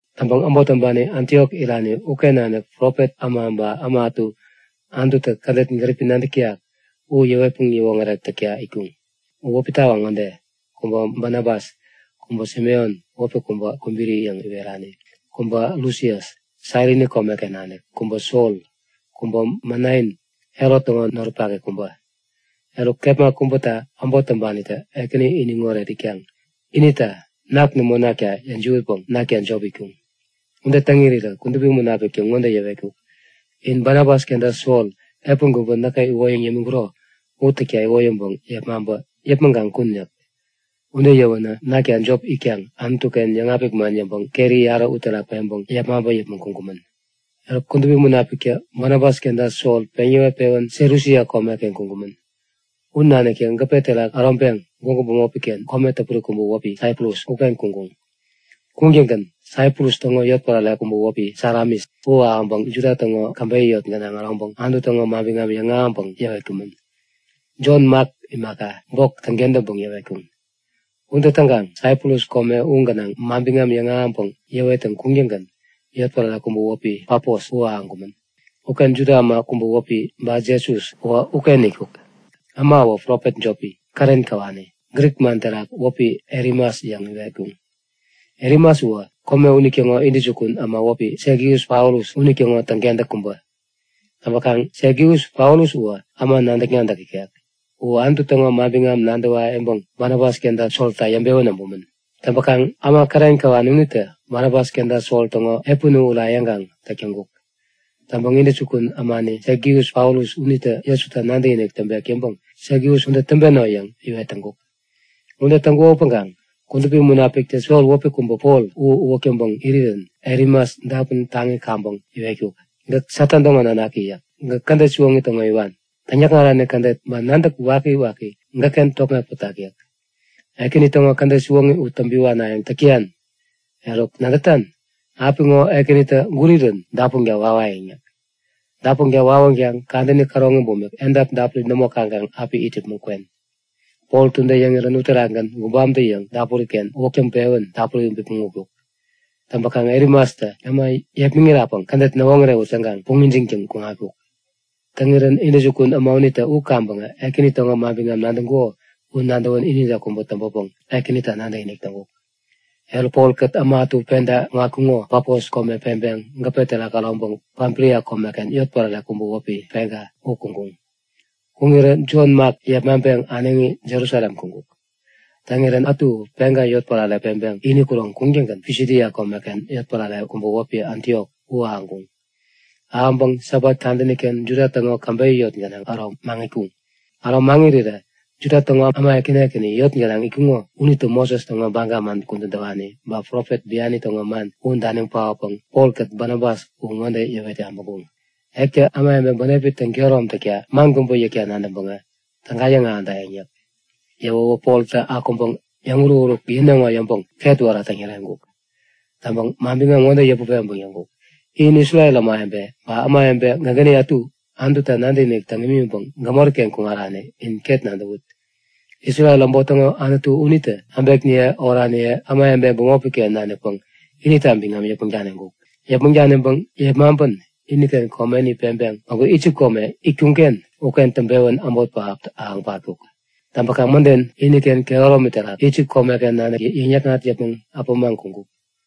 Täŋpäŋ äbot täŋpani Antiok irani uken nanik profet äma ba äma ätu Anututä kädet gäripi nadäk täyak u yäwetpäŋ yäwoŋärek täkta itkuŋ.U wäpi tawaŋ ŋode; Kubä Banabas, kubä Simeon wäpi kubä Kubiri yäŋ iwerani, kubä Lusias Sairini komeken nanik, kubä Sol, kubä Manain, Herot täŋo noripaki kubä. Eruk, kepma kubäta äbot täŋpanitä Ekäni iniŋoret itkaŋ inita nak nämo nakta yäjiwätpäŋ nakta jop itkuŋ. Ude täŋ irirä Kudupi Munapiktä ŋode yäwetkuk; In Banabas kenta Sol epän kubä näkä iwoyäŋ yämiŋkuro u täkta iwoyäŋpäŋ yepmaŋpä yäpmäŋ kaŋ kun yäk. Ude yäwänä nakta jop itkaŋ Anutu-ken yäŋapik man yäŋpäŋ keri yarä uterak peŋpäŋ yepmaŋpä yäpmäŋ kuŋkumän. Eruk Kudupi Munapiktä Banabas kenta Sol peŋ yäwet-pewän Selusia komeken kuŋkumän. U naniktä gäpe terak äroŋpeŋ gwägu bämopi-ken kome täpuri kubä wäpi Saiprus uken kuŋkuŋ. Kuŋtäŋgän Saiprus täŋo yotpärare kubä wäpi Salamis u ahäŋpäŋ Juda täŋo käbeyä yot gänaŋ äroŋpäŋ Anutu täŋo manbiŋam yäŋahäŋpäŋ yäwetkumän. Jon-Mak imaka, bok täŋkentäŋpäŋ yäwetkuŋ. Ude täŋkaŋ Saiprus kome u gänaŋ manbiŋam yäŋahäŋpäŋ yäwettäŋ kuŋtäŋgän yotpärare kubä wäpi Pafos u ahäŋkumän. Uken Juda äma kubä wäpi Bajesu uwä uken itkuk. Äma uwä profet jopi, kären käwani. Grik man terak wäpi Elimas yäŋ iwetkuŋ. Elimas u kome unitäŋo intäjukun äma wäpi Segius-Paulus unitäŋo täŋkentäk kubä. Täŋpäkaŋ Segius-Paulus uwä äma nadäk-nadäk ikek. U Anutu täŋo manbiŋam nadäwa yäŋpäŋ Banabas kenta Solta yäŋpewän äbumän. Täŋpäkaŋ äma kären käwani unitä Banabas kenta Sol täŋo epän u ura yäŋkaŋ täk täŋkuk. Täŋpäŋ intäjukun ämani Segius-Paulus unitä Jesuta nadäkinik täŋpek yäŋpäŋ Segius ude täŋpeno! yäŋ iwet täŋkuk. Ude täŋkuko upäŋkaŋ Kudupi Munapiktä Sol wäpi kubä Pol u uwäk täŋpäŋ irirän Elimas dapun taŋi kaŋpäŋ iwetkuk; Gäk Satan täŋo nanaki! yäk. Gäk kädet siwoŋi täŋo iwan. Täŋyäkŋarani kädet ba nadäk wakiwaki gäkken tokŋeŋ pätak yäk. Ekäni täŋo kädet siwoŋi u täŋpi wanayäŋ täk täyan! Eruk, nadätan? Apiŋo Ekänitä gurirän dapunka wawayäŋ yäk. Dapunka wawänkaŋ kadäni käroŋi bumik edap dapuri nämo kaŋkaŋ api it yäpmäŋ kwen! Poltä ude yäŋirän uterakgän gubamtä-yäŋ dapuri-ken uwäk täŋpewän dapuri bipmäŋ utkuk. Täŋpänkaŋ Elimastä äma yepmäŋirapäŋ kädet näwoŋärewut yäŋkaŋ puŋ ijiŋtäŋ kuŋatkuk. Täŋirän intäjukun äma unitä u kaŋpäŋ Ekäni täŋo manbiŋam nadäŋkuko u nadäwän inide kubä täŋpänpäŋ Ekänita nadäkinik täŋkuk. Eruk, Polkät äma ätu penta kuŋatkuŋo Pafos kome peŋpeŋ gäpe terak äroŋpeŋ Pamfilia komeken yotpärare kubä wäpi Pega u kuŋkuŋ. Kuŋirä Jon-Mak yepmaŋpeŋ äneŋi Jerusalem kuŋkuk. Täŋirän ätu u Pega yotpärare peŋpeŋ ini kuroŋ kuŋtäŋgän Pisidia komeken yotpärare kubä wäpi Antiok u ahäŋkuŋ. Ahäŋpäŋ Sabat kadäni-ken Juda täŋo käbeyä yot gänaŋ äro maŋitkuŋ. Äro maŋirirä Juda täŋo äma ekäni ekäni yot gänaŋ itkuŋo unitä Moses täŋo Baga man kudän täwani, ba profet biani täŋo man u daniŋ paotpäŋ Polkät Banabas u ŋode yäwet yabäŋkuŋ; Ektä ämawebe bänepi täŋkehärom takta man kubä yäkta nadäŋpäŋä täga yäŋahädayäŋ yäk. Yäwäwä Poltä akuŋpäŋ yäŋuruk-uruk yäneŋo yäŋpäŋ ketwära täŋyäreŋkuk. Täŋpäŋ manbiŋam ŋode yäput peŋpäŋ yäŋkuk; In Isrel ämawebe ba ämawebe gägäni ätu Anututa nadäkinik täŋ imiŋpäŋ gämori-ken kuŋarani in ket nadäwut! Isrel äbot täŋo Anutu unitä äbekniye oraniye, ämawebe bämopi-ken nanikpäŋ inita biŋam yäpmäŋ daniŋkuk. Yäpmäŋ daniŋpäŋ yepmaŋpän iniken komeni peŋpeŋ päŋku Isip kome itkuŋ-ken uken täŋpewän äbot pähap ahäŋ patkuk. Täŋpäkaŋ mäden, iniken kehäromi terak Isip komeken nanik yäŋ-yäkŋat yäpmäŋ äpämaŋ kuŋkuk.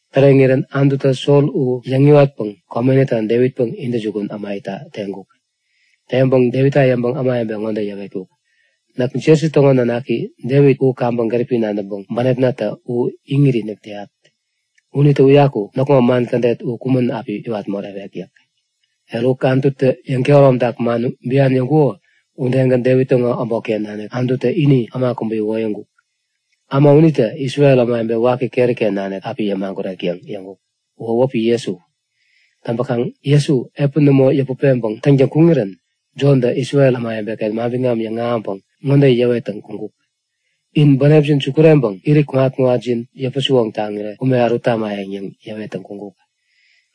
Täreŋirän Anututä Sol u yäŋiwatpäŋ komenita Devitpäŋ intäjukun äma itta teŋkuk. Teŋpäŋ Devitta yäŋpäŋ ämawebe ŋode yäwetkuk; Näk Jesi täŋo nanaki Devit u kaŋpäŋ gäripi nadäŋpäŋ bänepnatä u iŋit-inik täyat. Unitä uyaku näkŋo man kädet u kumän api iwat morewek yäk. Eruk, Anututä yäŋkehäromtak man bian yäŋkuko udegän Devit täŋo äbotken nanik Anututä ini äma kubä iwoyäŋkuk. Äma unitä Isrel ämawebe waki keri-ken nanik api yämagurek yäŋ yäŋkuk. Uwä wäpi Jesu. Täŋpäkaŋ Jesu epäni nämo yäput peŋpäŋ täŋtäŋ kuŋirän Jontä Isrel ämawebe-ken manbiŋam yäŋahäŋpäŋ ŋode yäwettäŋ kuŋkuk; In bänepjin sukureŋpäŋ irit kuŋat-kuŋatjin yäpä-siwoŋ täŋirä ume ärut tamayäŋ yäŋ yäwettäŋ kuŋkuk.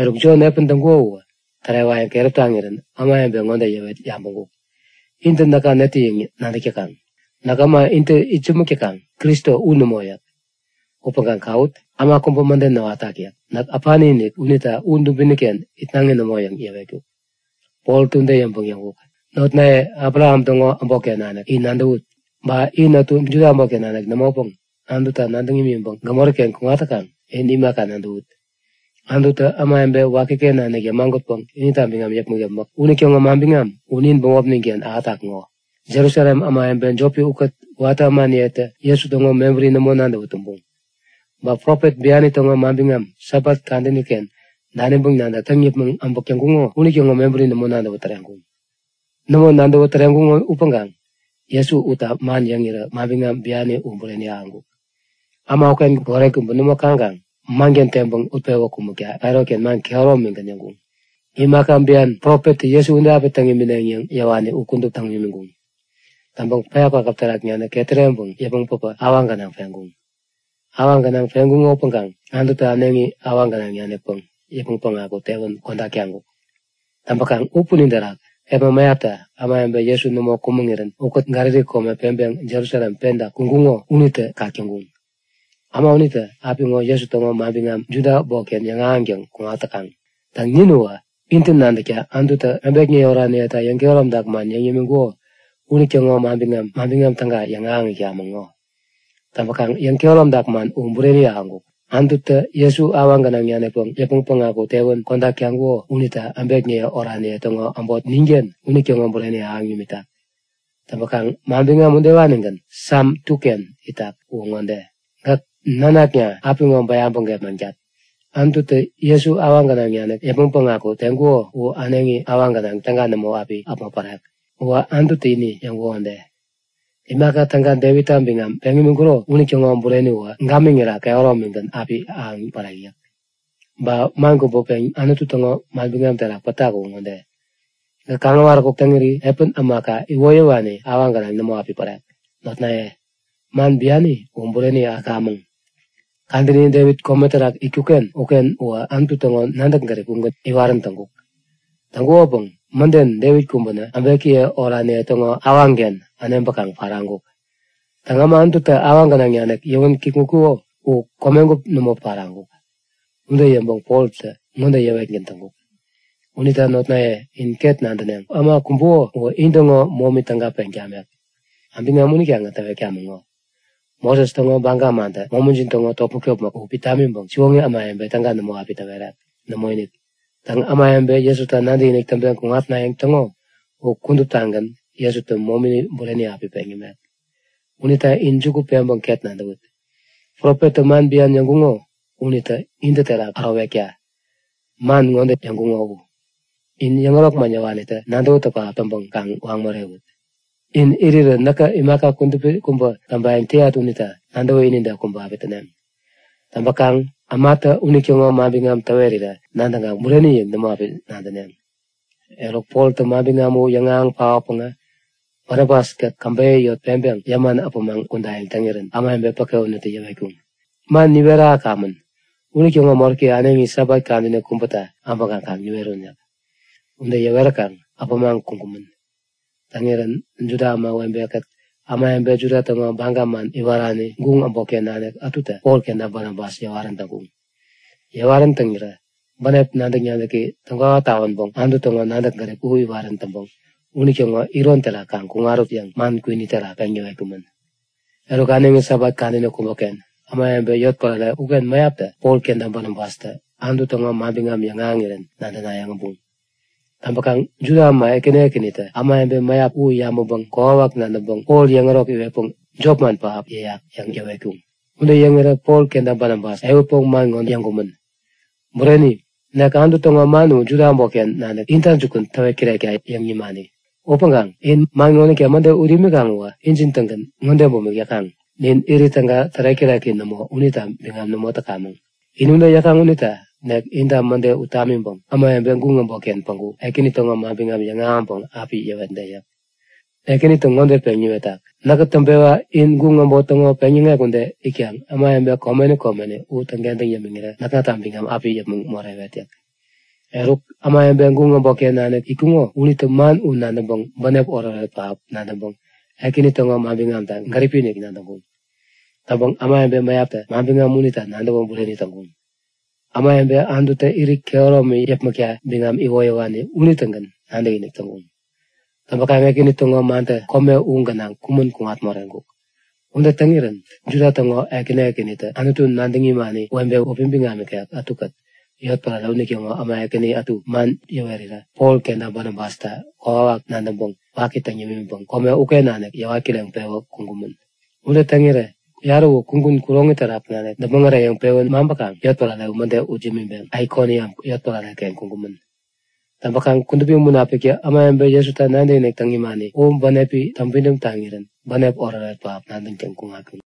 Eruk Jon epän täŋkuko u tärewayäŋ keräp taŋirän ämawebe ŋode yäwet yabäŋkuk; Intä näka netä yäŋ nadäk täkaŋ? Näk äma intä itsämäk täkaŋ, Kristo u nämo yäk. Upäŋkaŋ kawut! Äma kubä mäden näwatak yäk. Näk äpani-inik unita u dubini-ken itnaŋi nämo yäŋ yäwetkuk. Poltä ude yäŋpäŋ yäŋkuk; Notnaye Abraham täŋo äbotken nanik, in nadäwut! Ba in ätu Juda äbotken nanik nämopäŋ Anutu nadäŋ imiŋpäŋ gämori-ken kuŋat täkaŋ, in imaka nadäwut! Anututä ämawebe wakiken nanik yämagutpäŋ inita biŋam yäpmäk-yäpmäk unitäŋo manbiŋam u nin bämopnin-ken ahätak ŋo! Jerusalem ämawebe jopi ukät watä ämaniyetä Jesu täŋo mebäri nämo nadäwä tumbuŋ. Ba profet biani täŋo manbiŋam Sabat kadäni-ken daniŋpäŋ nadäk täŋ yäpmäŋ äbäk täŋkuŋo unitäŋo mebäri nämo nadäwä täreŋkuŋ. Nämo nadäwä täreŋkuŋo upäŋkaŋ Jesu utta man yäŋirä manbiŋam biani u bureni ahäŋkuk. Äma uken goret kubä nämo kaŋkaŋ manken teŋpäŋ utpewä kumäkta Pailat-ken man kehäromigän yäŋkuŋ. Imaka bian profettä Jesu ude api täŋ imineŋ yäŋ yäwani u kudup täŋ imiŋkuŋ. Täŋpäŋ päya kwakäp terak nanik ketäreŋ yäpmäŋ päpä awaŋ gänaŋ peŋkuŋ. Awaŋ gänaŋ peŋkuŋo upäŋkaŋ Anututä äneŋi awaŋ gänaŋ nanikpäŋ yäpmäŋ päŋaku tewän kodak taŋkuk. Täŋpäkaŋ u punin terak kepma mäyapta ämawebe Jesu nämo kumäŋirän ukät Galili kome peŋpeŋ Jerusalem penta kuŋkuŋo unitä kak täŋkuŋ. Äma unitä apiŋo Jesu täŋo manbiŋam Juda äbotken yäŋahäŋtäŋ kuŋat täkaŋ. Täŋ, nin uwä intä nadäkta Anututä äbekniye oraniyeta yäŋkehäromtak man yäŋ yämiŋkuko unitäŋo Manbiŋam Täga yäŋahäŋ itkamäŋ ŋo. Täŋpäkaŋ yäŋkehäromtak man u bureni ahäŋkuk. Anututä Jesu awaŋ gänaŋ nanikpäŋ yäpmäŋ päŋaku tewän kodak taŋkuko unita äbekniye oraniye täŋo äbot ninken unitäŋo bureni ahäŋ nimitak. Täŋpäŋ manbiŋam udewanigän Sam 2-ken itak. Uwä ŋode; Gäk nanakna. Apiŋo bäyaŋpäŋ gepmaŋtat. Anututä Jesu awaŋ gänaŋ nanik yäpmäŋ päŋaku teŋkuko u äneŋi awaŋ gänaŋ täga nämo api äpmo parawek. Uwä Anututä ini yäŋkuko ude; Imaka täga Devitta biŋam peŋ imiŋkuro unitäŋo bureni uwä gamiŋira kehäromigän api ahäŋ pärek yäk. Ba man kubä pen Anutu täŋo manbiŋam terak pätak u ŋode; Gäk kaŋ-äwaräkuk täŋiri epän ämaka iwoyäwani awaŋ gänaŋ nämo api parawek. Notnaye, man biani u bureni ahäŋirän käkamäŋ. Kadäni Devit kome terak itkuk-ken uken uwä Anutu täŋo nadäk-gärip ugän iwarän täŋkuk. Täŋkukopäŋ mäden Devit kumbänä äbekiye oraniye täŋo awaŋken äneŋpäkaŋ paraŋkuk. Täŋ, äma Anututä awaŋ gänaŋ nanik yäwän kikŋutkuko u komegup nämo paraŋkuk. Ude yäŋpäŋ Poltä ŋode yäwetgän täŋkuk; Unita notnaye in ket nadäneŋ; Äma kumbuko uwä intäŋo momi täga peŋ tamek. Manbiŋam unitagän täwetkamäŋ ŋo. Moses täŋo baga mantä momijin täŋo topmäk-topmäk u pit tamiŋpäŋ siwoŋi ämawebe täga nämo api täwerek. Nämoinik. Täŋ, ämawebe Jesuta nadäkinik täŋpeŋ kuŋatnayäŋ täŋo u kuduptagän Jesutä momini bureni api peŋ yämek. Unita in juku peŋpäŋ ket nadäwut! Profettä man bian yäŋkuŋo unitä intä terak ärowekta. Man ŋode yäŋkuŋo u; In yäŋärok man yäwanitä nadäwätäk pähap täŋpäŋ kaŋ waŋ morewut! In irirä näkä imaka kudupi kubä täŋpayäŋ täyat unita nadäwä inide kubä api täneŋ. Täŋpäkaŋ ämatä unitäŋo manbiŋam täwerirä nadäŋkaŋ bureni yäŋ nämo api nadäneŋ. Eruk, Poltä manbiŋam u yäŋahäŋ paotpäŋä Banabas-kät käbeyä yot peŋpeŋ yäman äpämaŋ kudayäŋ täŋirän ämawebe päke unitä yäwetkuŋ; Man niwet ahäkamän unitäŋo moräki äneŋi Sabat kadäni kubäta äbäŋkaŋ kaŋ niwerun yäk. Ude yäweräkaŋ äpämaŋ kuŋkumän. Täŋirän Juda ämawebe-kät ämawebe Juda täŋo baga man iwarani guŋ äbotken nanik ätutä Pol kenta Banabas yäwarän täŋkuŋ. Yäwarän täŋirä bänep nadäk-nadäki täŋkwawa tawänpäŋ Anutu täŋo nadäk-gärip u iwarän täŋpäŋ unitäŋo iron terak kaŋ kuŋarut yäŋ man kwini terak peŋ yäwetkumän. Eruk äneŋi Sabat kadäni kubäken ämawebe yotpärare uken mäyaptä Pol kenta Banabastä Anutu täŋo manbiŋam yäŋahäŋirän nadänayäŋ äbuŋ. Täŋpäkaŋ Juda äma ekäni ekänitä ämawebe mäyap u yabäŋpäŋ kokwawak nadäŋpäŋ Pol yäŋärok iwetpäŋ jopman pähap yäyak! yäŋ yäwetkuŋ. Ude yäŋirä Pol kenta Banabas ehutpäŋ man ŋode yäŋkumän; Bureni! Nek Anutu täŋo man Juda äbotken nanik inta jukun täwet kirekta yäŋ nimani. Upäŋkaŋ in man ŋonita mäde ut imikaŋ uwä injin-tägän ŋode bumik yäkaŋ; Nin irit täga tärek-täreki nämo unita biŋam nämo täkamäŋ. In ude yäkaŋ unita nek inta mäde ut tamiŋpäŋ ämawebe guŋ äbotken päŋku Ekäni täŋo manbiŋam yäŋahäŋpäŋ api yäwetde yäk. Ekänitä ŋode peŋ niwetkuk; Näkä täŋpewa in guŋ äbot täŋo peŋyäŋek ude itkaŋ ämawebe komeni komeni u täŋkentäŋ yämiŋirä näkŋata biŋam api yäpmäŋ morewet yäk. Eruk, ämawebe guŋ äbotken nanik itkuŋo unitä man u nadäŋpäŋ bänep oretoret pähap nadäŋpäŋ Ekäni täŋo manbiŋamta gäripi-inik nadäŋkuŋ. Täŋpäŋ ämawebe mäyaptä manbiŋam unita nadäwä bureni täŋkuŋ. Ämawebe Anututä irit kehäromi yäpmäkta biŋam iwoyäwani unitägän nadäkinik täŋkuŋ. Täŋpäkaŋ Ekäni täŋo mantä kome u gänaŋ kumän kuŋat moreŋkuk. Ude täŋirän Juda täŋo ekäni ekänitä Anutu nadäŋ imani webe wäpi biŋam ikek ätukät yotpärare unitäŋo äma ekäni ätu man yäput-yäwerirä Pol kenta Banabasta kokwawak nadäŋpäŋ waki täŋ yämiŋpäŋ kome uken nanik yäwat kireŋpewä kuŋkumän. Ude täŋirä yarä u kugun kuroŋi terak nanik däpmäŋ äreyäŋpewän maŋpäkaŋ yotpärare u mäde ut imiŋpäŋ Aikoniam yotpärare-ken kuŋkumän. Täŋpäkaŋ Kudupi Munapiktä ämawebe Jesuta nadäkinik täŋ imani u bänepi täŋpidäm taŋirän bänep oretoret pähap nadäŋtäŋ kuŋatkuŋ.